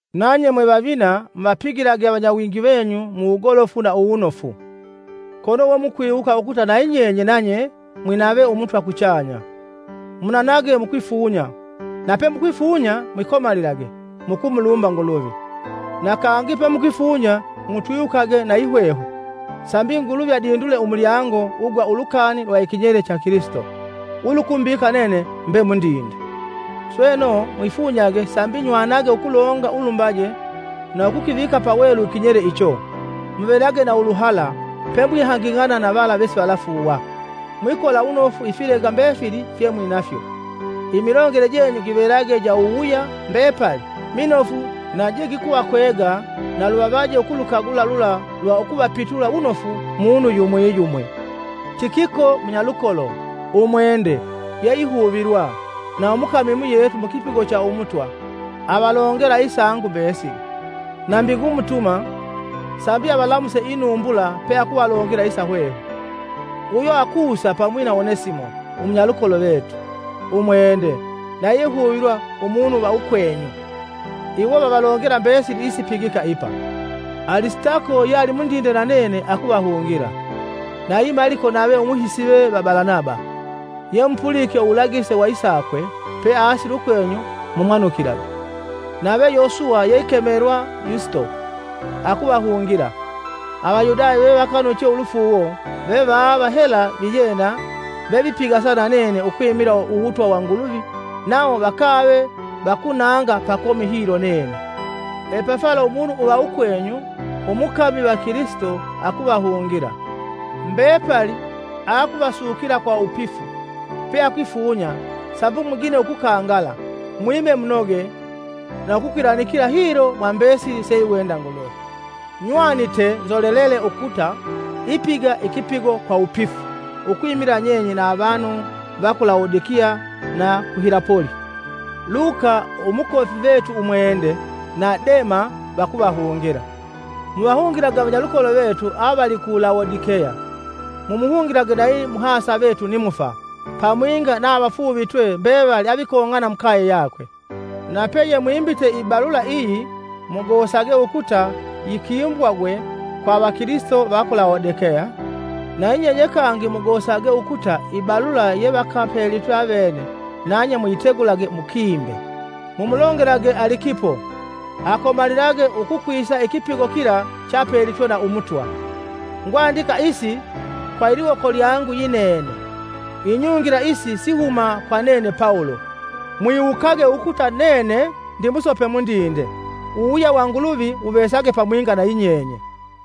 Nanye mwe vavina, muvapigilage avanyawingi venyu mu wugolofu na uwunofu, kono we mukwiwuka ukuta na yinyenye nanye mwinave umutwa kuchanya. Munanage mukwifunya, na pemukwifunya mwikomalilage, mukumulumba Nguluvi. Na kangi pemukwifunya mutwiwukage na yihwehwe sambi Nguluvi adindule umulyango ugwa ulukani lwa ikinyele cha Kilisito ulukumbika nene mbe mundinde. Sweno, mwifunyage sambi nywanage ukulonga ulumbaje na ukukivika pawelu ikinyele icho. Muvelage na uluhala pemwihanging'ana na vala vesivalafuuwa, mwikola wunofu ifilega mbefili fyemwinafyo. Imilongele jenyu givelage ja uwuwuya mbepali minofu na je gikuvakwega na luvavaje ukulukagula lula lwa ukuvapitula wunofu munu yumwi yumwi. Tikiko, Munyalukolo, umwende, yeihuvilwa, na umukami umuyetu mukipigo cha umutwa, avalongela isangu mbesili. Nambi ngumutuma, sambi avalamuse inumbula peakuvalongela isa hwehwe. Uyo akusa pamwi na Onesimo, umunyalukolo vetu, umwende, na yeihuvilwa, umunu va ukwenyu. Iwo vavalongela mbesili isipigika ipa. Alisitako yealimundinde na nene, akuvahungila; nayi Maliko nave umuhisive va Balanaba (yemupulike uwulagise wa isakwe, peasile ukwenyu mumwanukilage.) Nave Yosuwa yeikemelwa Yusito; akuvahungila. Avayudaya vevakanuche ulufuuwo, ve vava hela viyena vevipigasa na nene ukwimila Uwutwa wa Nguluvi nawo vakave vakunanga pakomi hilo nene. Epafala umunu uva ukwenyu umukami va kilisito akuvahungila. Mbepali aakuvasukila kwa wupifu peakwifunya sambi mugine ukukangala, mwime munoge na ukukwilanikila hilo mwa mbesili seiwenda Nguluvi. Nywanite nzolelele ukuta ipiga ikipigo kwa wupifu ukwimila nyenye na avanu va ku Lawodikeya na ku Hilapoli. Luka, umukofi vetu umwende, na Dema vakuvahungila. Muvahungilage avanyalukolo vetu avali ku Lawodikeya mumuhungilage nayi muhasa vetu Nimufa, pamwinga na avafuuvitwe mbevali avikong'ana mukaye yakwe. Na peyemwimbite ibalula iyi, mugosage ukuta yikimbwagwe kwa avakilisito va ku Lawodikeya; na yinyenye kangi mugosage ukuta ibalula yevakapelitwe avene nanye muyitegulage mukiimbe. Mumulongelage Alikipo, akomalilage ukukwisa ikipigo kila cheapelitwe na Umutwa. Ngwandika isi kwa iliwoko lyangu yinene; inyungila isi sihuma kwa nene Pawulo. Mwiwukage ukuta nene ndimusope mundinde. Uwuwuya wa Nguluvi wuvesage pamwinga na yinyenye.